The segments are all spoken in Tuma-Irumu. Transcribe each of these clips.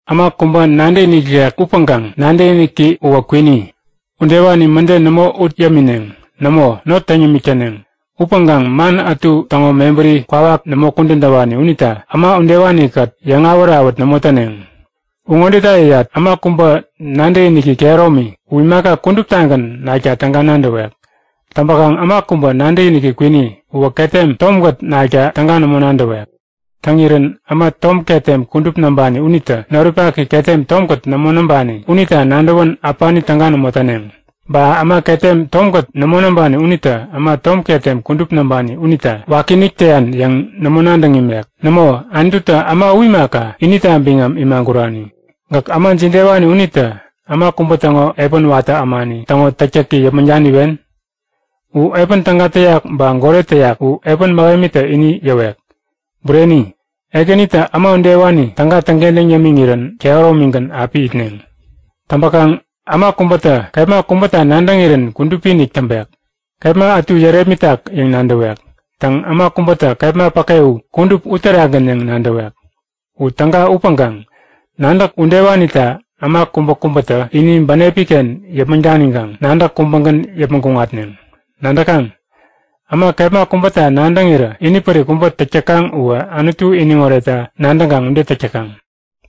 Äma kubä nadäkinik ikek upäŋkaŋ nadäkiniki uwä kwini, udewani mäde nämo ut yämineŋ. Nämo, not täŋ yämik täneŋ. Upäŋkaŋ man ätu täŋo mebäri kwawak nämo kudän täwani unita äma udewani-kät yäŋawät-awät nämo täneŋ. U ŋodeta yäyat; Äma kubä nadäkiniki kehäromi u imaka kuduptagän nakta täga nadäwek. Täŋpäkaŋ äma kubä nadäkiniki kwini uwä ketem tomkät nakta täga nämo nadäwek. Täŋirän äma tom ketem kudup näŋpani unitä noripaki ketem tomkät nämo näŋpani unita nadäwän äpani täga nämo täneŋ. Ba äma ketem tomkät nämo näŋpani unitä äma tom ketem kudup näŋpani unita wakiinik täyan yäŋ nämo nadäŋ imek. Nämo, Anututä äma u imaka, inita biŋam imagurani. Gäk äma jidewani unitä äma kubä täŋo epän watä ämani täŋo täktäki yäpmäŋ daniwen? U epän täga täyak ba goret täyak u epän mähemitä ini yäwek. Bureni, Ekänitä äma udewani täga täŋkentäŋ yämiŋirän kehäromigän api itneŋ. Täŋpäkaŋ äma kubätä kepma kubäta nadäŋirän kudupi-inik täŋpek, kepma ätu yärepmitak yäŋ nadäwek. Täŋ, äma kubätä kepma päke u kudup uterakgän yäŋ nadäwek. U täga upäŋkaŋ nadäk udewanita äma kubäkubätä ini bänepiken yäpmäŋ daniŋkaŋ nadäk kubägän yäpmäŋ kuŋatneŋ. Nadäkaŋ? Äma kepma kubäta nadäŋirä inipärik kubä täk täkaŋ uwä Anutu iniŋoretta nadäŋkaŋ ude täk täkaŋ.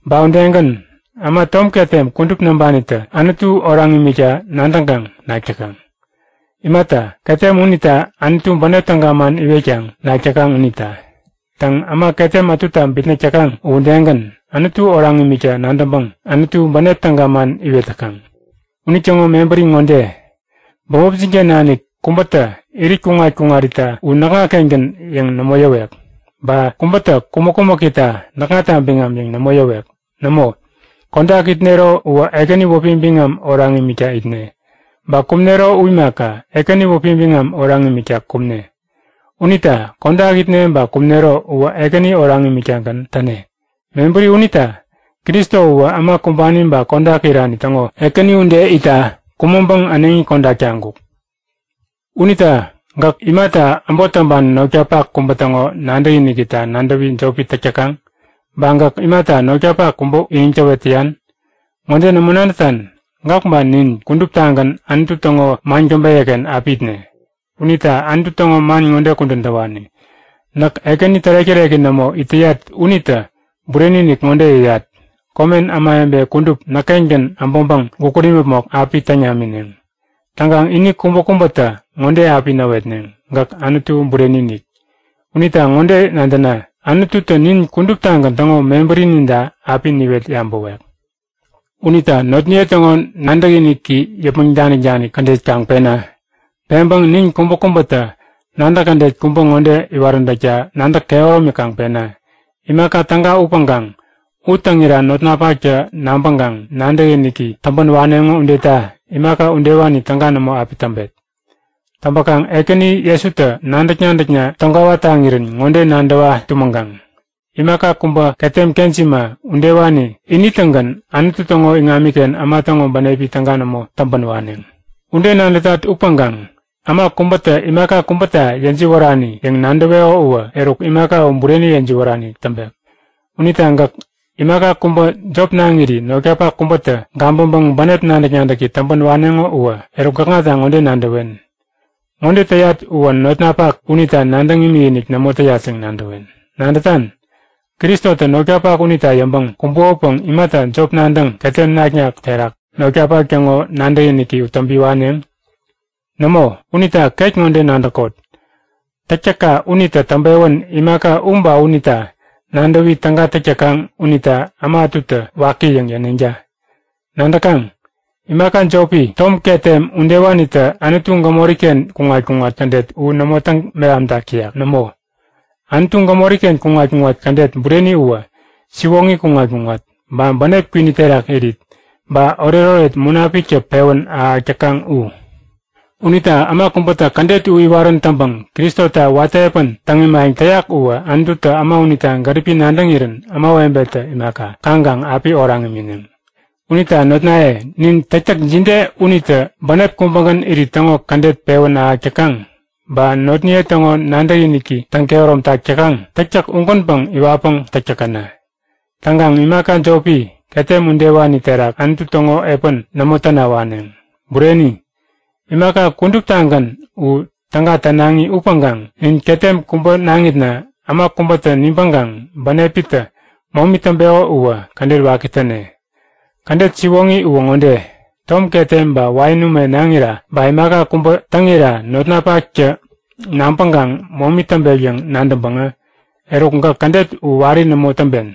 Ba udegän, äma tom ketem kudup näŋpanitä Anutu oraŋ imikta nadäŋkaŋ nak täkaŋ. Imata, ketem unita Anutu bänep täga man iwetkaŋ nak täkaŋ unita. Täŋ, äma ketem ätuta bitnäk täkaŋ uwä udegän, Anutu oraŋ imikta nadäŋpäŋ Anutu bänep täga man iwet täkaŋ. Unitäŋo mebäri ŋode; Bämopnin-ken nanik kubätä irit kuŋat-kuŋarita u näkŋa-kengän yäŋ nämo yäwek. Ba kubätä kumäk-kumäkita näkŋata biŋam yäŋ nämo yäwek. Nämo, kodak itnero uwä Ekäni wäpi biŋam oraŋ imikta itne. Ba kumnero u imaka, Ekäni wäpi biŋam oraŋ imikta kumne. Unita kodak itne ba kumnero uwä Ekäni oraŋ imiktagän täne. Mebäri unita, Kristo uwä äma kumbani ba kodak irani täŋo Ekäni ude itta kumäŋpäŋ äneŋi kodak taŋkuk. Unita gäk, imata äbot täŋpani notkapak kubä täŋo nadäkinikita nadäwi jopi täk täkaŋ? Ba gäk, imata notkapak kubä iniŋ täwet täyan? Ŋode nämo nadätan? Gäk ba nin kuduptagän Anutu täŋo man käbeyä-ken api itne. Unita Anutu täŋo man ŋode kudän täwani; Näk Ekäni tärek-täreki nämo it täyat unitä bureni-inik ŋode yäyat; Komen ämawebe kudup näk-kengän äbäŋpäŋ gukut imäpmok api täŋ namineŋ. Täŋkaŋ ini kubäkubätä ŋode api näwetneŋ; Gäk Anutu bureni-inik. Unita ŋode nadäna; Anututä nin kuduptagän täŋo mebärininta api niwet yabäwek. Unita notniye täŋo nadäkiniki yäpmäŋ danik-danik kädet kaŋ pena! Peŋpäŋ nin kubäkubätä nadäk kädet kubä ŋode iwaräntäkta nadäk kehäromi kaŋ pena; Imaka täga upäŋkaŋ u täŋira notnapaktä nabäŋkaŋ nadäkiniki täŋpän waneŋo udeta imaka udewani täga nämo api täŋpet. Täŋpäkaŋ Ekäni Jesutä nadäk-nadäkna täŋkwawa taŋirän ŋode nadäwa tumäŋkaŋ; Imaka kubä ketem kejima udewani ini-tägän Anutu täŋo iŋamiken äma täŋo bänepi täga nämo täŋpän waneŋ. Ude nadätat upäŋkaŋ äma kubätä imaka kubäta yäjiwärani yäŋ nadäweko uwä eruk imaka u bureni yäjiwärani täŋpek. Unita gäk imaka kubä jop naŋiri notkapak kubätä gabäŋpäŋ bänep nadäk-nadäki täŋpän waneŋo uwä eruk gäkŋata ŋode nadäwen; Ŋode täyat uwä notnapak unita nadäŋ imikinik nämo täyat yäŋ nadäwen. Nadätan? Kristotä notkapak unita yäŋpäŋ kumbukopäŋ imata jop nadäŋ ketem naknak terak notkapak täŋo nadäkiniki u täŋpi waneŋ? Nämo, unita ket ŋode nadäkot; Täktäkka unitä täŋpewän imaka u ba unita nadäwi täga täk täkaŋ unita äma ätutä waki yäŋ yäneŋta. Nadäkaŋ, imaka jopi, tom ketem udewanitä Anutu gämori-ken kuŋat-kuŋat kädet u nämo täŋ-mehamtäk täyak. Nämo, Anutu gämori-ken kuŋat-kuŋat kädet bureni uwä siwoŋi kuŋat-kuŋat, ba bänep kwini terak irit, ba oretoret Munapiktä pewän ahäk täkaŋ u. Unita äma kubätä kädet u iwarän täŋpäŋ Kristota watä epän täŋ imayäŋ täyak uwä Anututä äma unita gäripi nadäŋirän ämawebetä imaka, kaŋkaŋ api oraŋ imineŋ. Unita notnaye, nin täktäk jide unitä bänep kubägän irit täŋo kädet pewän ahäk täkaŋ ba notniye täŋo nadäkiniki täŋ-kehäromtak täkaŋ, täktäk ugänpäŋ iwatpäŋ täk täkäna. Täŋkaŋ imaka jopi, ketem udewani terak Anutu täŋo epän nämo täna waneŋ. Bureni, imaka kuduptagän u täga nänaŋi upäŋkaŋ nin ketem kubä naŋitna äma kubätä nibäŋkaŋ bänepitä momi täŋpeko uwä kädet waki täne. Kädet siwoŋi uwä ŋode; Tom ketem ba wain ume naŋira ba imaka kubä täŋira notnapaktä nabäŋpäŋ momi täŋpek yäŋ nadäŋpäŋä eruk gäk kädet u wari nämo täŋpen.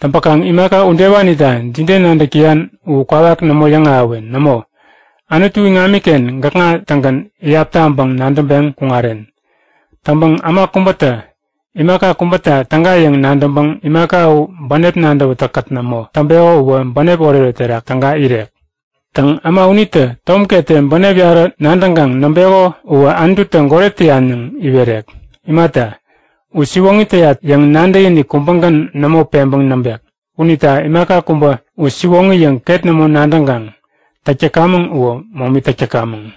Täŋpäkaŋ imaka udewanita jide nadäk täyan u kwawak nämo yäŋahäwen. Nämo, Anutu iŋamiken gäkŋa-tagän iyap taŋpäŋ nadäŋpeŋ kuŋaren. Täŋpäŋ äma kubätä imaka kubäta täga yäŋ nadäŋpäŋ imaka u bänep nadäwätäk-kät nämo täŋpeko uwä bänep oretoret terak täga irek. Täŋ, äma unitä tom ketem bänep yarä nadäŋkaŋ näŋpeko uwä Anututä goret täyan yäŋ iwerek. Imata, u siwoŋi täyat yäŋ nadäkinik kubägän nämo peŋpäŋ täŋpek. Unita imaka kubä u siwoŋi yäŋ ket nämo nadäŋkaŋ täk täkamäŋ uwä momi täk täkamäŋ.